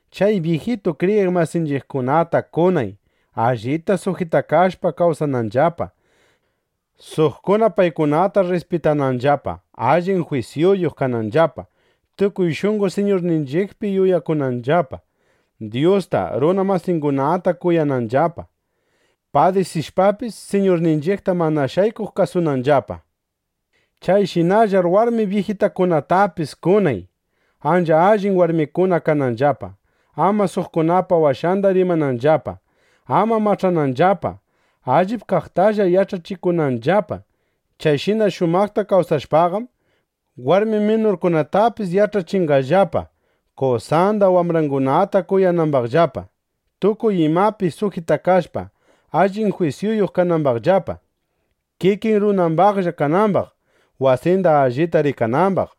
Chay byijitu kriyiq masinchiqkunata kunay, allita sujitakashpa kawsananllapa, suqkuna paykunata rrispitananllapa, allin jwisyuyuq kananllapa, tukuy shunqo Siñurninchiqpi yuyakunanllapa, Dyusta, runa masingunata kuyananllapa, padisishpapis Siñurninchiqta mana shaykuq kasunanllapa. Chayshinallar warmi byijitakunatapis kunay, ancha allin warmikuna kananllapa, ama suqkunapa washanda rimananllapa, ama mach'ananllapa, allip kaqtalla yach'achikunanllapa. Chayshina shumaqta kawsashpaqam, warmi minurkunatapis yach'achinqallapa, qosanda, wambrangunata kuyanambaqllapa, tukuy imapi sujitakashpa allin jwisyuyuq kanambaqllapa, kikin runambaqlla kanambaq, wasinda allita rikanambaq,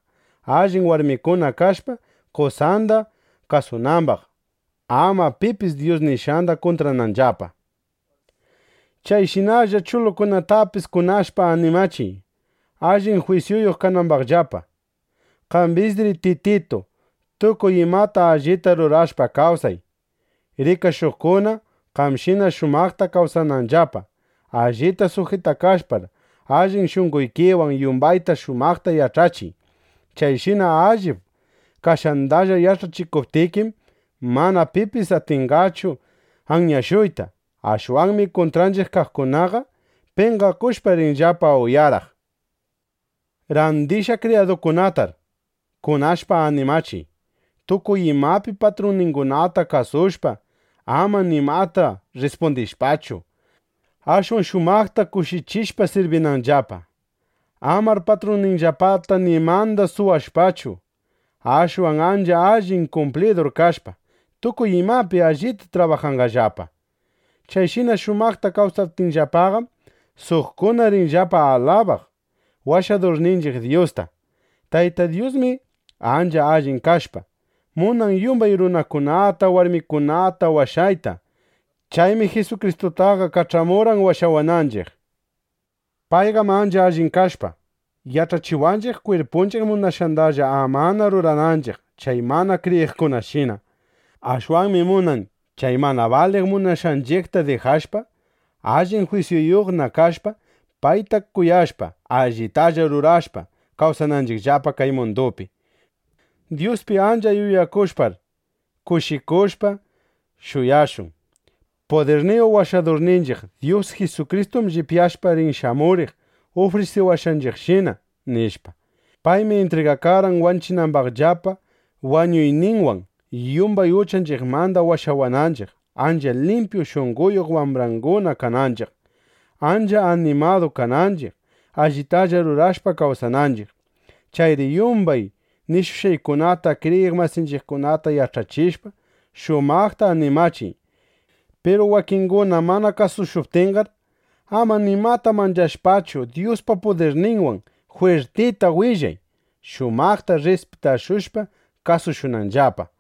allin warmikuna kashpa, qosanda kasunambaq, ama pipis Dyus nishqanda kuntrananllapa. Chayshinalla chulukunatapis kunashpa animachiy, allin jwisyuyuq kanambaqllapa. Qambisri, Tititu, tukuy imata allita rurashpa kawsay, rikashuqkuna, qamshina shumaqta kawsananllapa. Allita sujitakashpar, allin shunqoykiwan, yumbayta shumaqta yach'achiy. Chayshina allip kashqandalla yach'achikuptikim, mana pipis atinqachu anyashuyta. Ashwanmi kuntranchiq kaqkunaqa, penqakushpa, rinllapa uyaraq. Randishqa kriyadukunatar kunashpa animachiy, tukuy imapi patrunningunata kasushpa, ama nimata rrispundishpachu, ashwan shumaqta kushichishpa sirbinanllapa. Amar patrunninllapata nimanda suwashpachu, ashwan ancha allin kumplidur kashpa, tukuy imapi allita trabajanqallapa. Chayshina shumaqta kawsaptinllapaqam, suqkuna rinllapa alabaq Washadurninchiq Dyusta. Tayta Dyusmi ancha allin kashpa, munan yumbay runakunata, warmikunata washayta. Chaymi Jisukristutaqa kach'amurqan washawananchiq. Payqam ancha allin kashpa, yach'achiwanchiq, kwirpunchiq munashqandalla amana rurananchiq chay mana kriyiqkunashina. Ashwanmi munan, chay mana baliq munashqanchiqta dijashpa, allin jwisyuyuqna kashpa, payta kuyashpa, allitalla rurashpa, kawsananchiqllapa kay mundupi. Dyuspi ancha yuyakushpar, kushikushpa, shuyashun: Pudirniyuq Washadurninchiq Dyus Jisukristum llipyashpa rin shamuriq ufrisiwashqanchiqshina, nishpa. Paymi intrigakarqan wanchinambaqllapa, wañuyninwan yumbay uchanchiqmanda washawananchiq, ancha limpyu shunqoyuq wambrangunana kananchiq, ancha animadu kananchiq, allitalla rurashpa kawsananchiq. Chayri yumbay nishushqaykunata kriyiq masinchiqkunata yach'achishpa, shumaqta animachiy. Piru wakinguna mana kasushuptinqar, ama nimata manchashpachu, Dyuspa pudirninwan jwirtita willay, shumaqta rrispitashushpa kasushunanllapa.